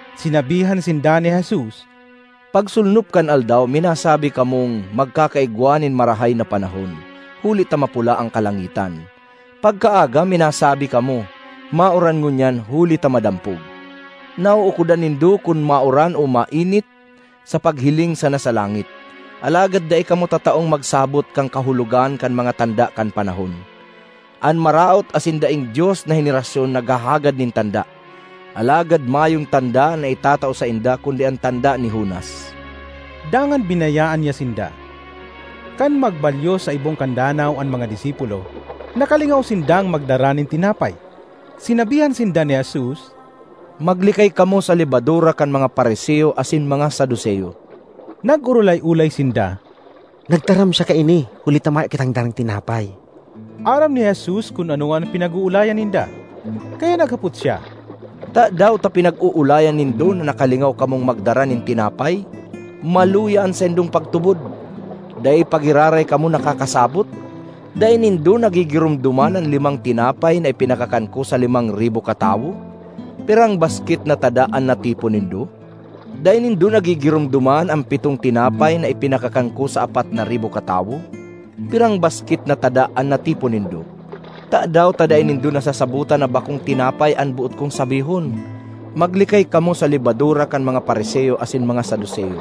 Sinabihan sinda ni Jesus, “Pagsolnop kan aldaw minasabi kamong, ‘Magkakaigwa nin marahay na panahon, huli ta mapula an kalangitan.’ Pagkaaga minasabi kamo, ‘Mauran ngunyan huli ta madampog.’ Nauukodan nindo kun mauran o mainit sa paghiling sana sa langit, alagad dai kamo tataong magsabot kan kahulogan kan mga tanda kan panahon! An maraot asin daing-Dios na henerasyon naghahagad nin tanda, alagad mayong tanda na itatao sainda kundi an tanda ni Jonas.” Dangan binayaan niya sinda. Kan magbalyo sa ibong kan danaw an mga disipulo, nakalingaw sindang magdara nin tinapay. Sinabihan sinda ni Jesus, “Maglikay kamo sa lebadura kan mga Fariseo asin mga Saduceo.” Nag-orolay-olay sinda, “Nagtaram siya kaini huli ta mayo kitang darang tinapay.” Aram ni Jesus kun ano an pinag-oolayan ninda, kaya naghapot siya, “Tadaw ta pinag-oolayan nindo na nakalingaw kamong magdara nin tinapay? Maluya an saindong pagtubod! Dai pa giraray kamo nakakasabot? Dai nindo nagigiromdoman an limang tinapay na ipinakakan ko sa limang ribo katawo? Pirang basket na tada an natipon nindo? Dai nindo nagigiromdoman an pitong tinapay na ipinakakan ko sa apat na ribo katawo? Pirang basket na tada an natipon nindo? Tadaw ta dai nindo nasasabotan na bakong tinapay an boot kong sabihon? Maglikay kamo sa lebadura kan mga Fariseo asin mga Saduceo.”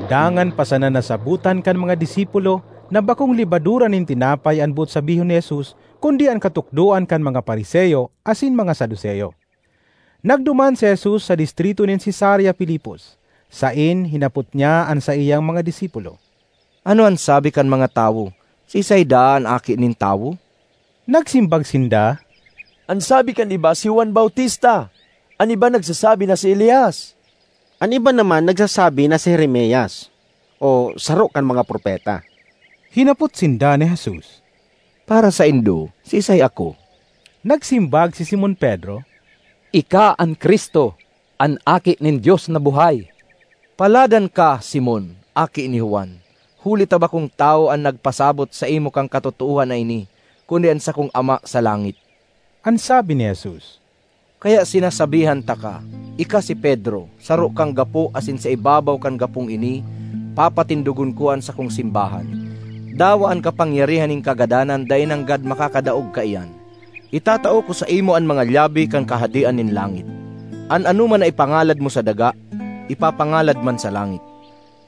Dangan pa sana nasabotan kan mga disipulo na bakong lebadura nin tinapay an boot sabihon ni Jesus kundi an katukdoan kan mga Fariseo asin mga Saduceo. Nagduman si Jesus sa distrito nin Cesarea Filipos, saen hinapot niya an saiyang mga disipulo, “Ano an sabi kan mga tawo, siisay daa an Aki nin Tawo?” Nagsimbag sinda, “An sabi kan iba si Juan Bautista. An iba nagsasabi na si Elias, an iba naman nagsasabi na si Jeremias o saro kan mga propeta.” Hinapot sinda ni Jesus, “Para saindo, siisay ako?” Nagsimbag si Simon Pedro, “Ika an Cristo, an Aki nin Dios na buhay.” ”Paladan ka, Simon, aki ni Juan! Huli ta bakong tawo an nagpasabot saimo kan katotoohan na ini kundi an sakong Ama sa langit,” an sabi ni Jesus. ”Kaya sinasabihan taka: Ika si Pedro, saro kang gapo asin sa ibabaw kan gapong ini papatindogon ko an sakong simbahan; dawa an kapangyarihan nin kagadanan dai nanggad makakadaog kaiyan. Itatao ka (ko) saimo an mga Iyabe (lyabe) kan Kahadean nin langit; (an anoman na ipangalad mo sa daga), ipapangalad man sa langit;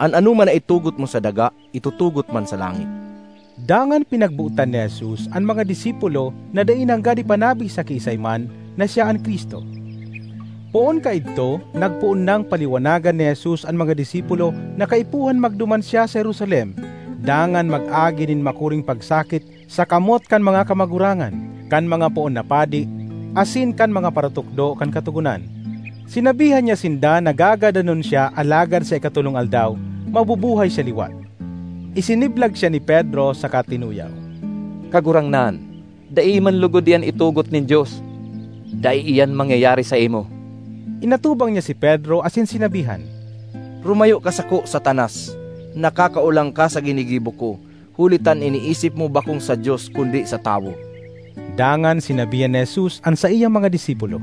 an anoman na itugot mo sa daga, itutugot man sa langit.” Dangan pinagbotan ni Jesus an mga disipulo na dai nanggad ipanabi sa kiisay man na siya an Cristo. Poon kaidto nagpoon nang paliwanagan ni Jesus an mga disipulo na kaipuhan magduman siya sa Jerusalem dangan mag-agi nin makuring pagsakit sa kamot kan mga kamagurangan, kan mga poon na padi, asin kan mga paratukdo kan Katogonan. Sinabihan niya sinda na gagadanon siya alagad sa ikatolong aldaw mabubuhay siya liwat. Isiniblag siya ni Pedro saka tinuyaw, “Kagurangnan, dai man logod iyan itugot nin Dios! Dai iyan mangyayari saimo!” Inatubang niya si Pedro asin sinabihan, “Rumayo ka sako, Satanas! Nakakaolang ka sa ginigibo ko, huli ta an iniisip mo bakong sa Dios, kundi sa tawo.” Dangan sinabihan ni Jesus an saiyang mga disipulo,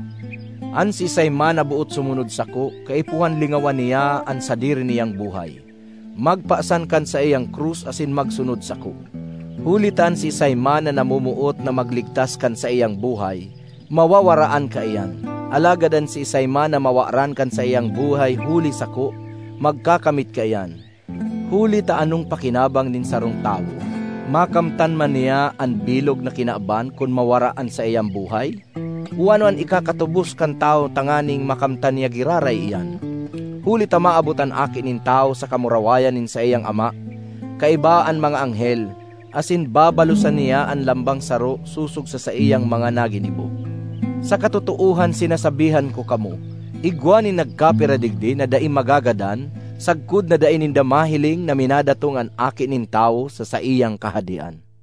“An siisay man na boot sumunod sako, kaipuhan lingawan niya an sadiri niyang buhay, magpasan kan saiyang krus asin magsunod sako. Huli ta an siisay man na namomoot na magligtas kan saiyang buhay, mawawaraan kaiyan; alagad an siisay man na mawaran kan saiyang buhay huli sako, magkakamit kaiyan. Huli ta anong pakinabang nin sarong tawo, makamtan man niya an bilog na kinaban kun mawara an saiyang buhay? O ano an ikakatubos kan tawo tanganing makamtan niya giraray iyan? Huli ta maabot an Aki nin Tawo sa kamurawayan nin saiyang Ama kaiba an mga anghel, asin babalosan niya an lambang saro sosog sa saiyang mga naginibo. Sa katotoohan sinasabihan ko kamo, igwa nin nagkapira digdi na dai magagadan sagkod na dai ninda mahiling na minadatong an Aki nin Tawo sa saiyang Kahadean.”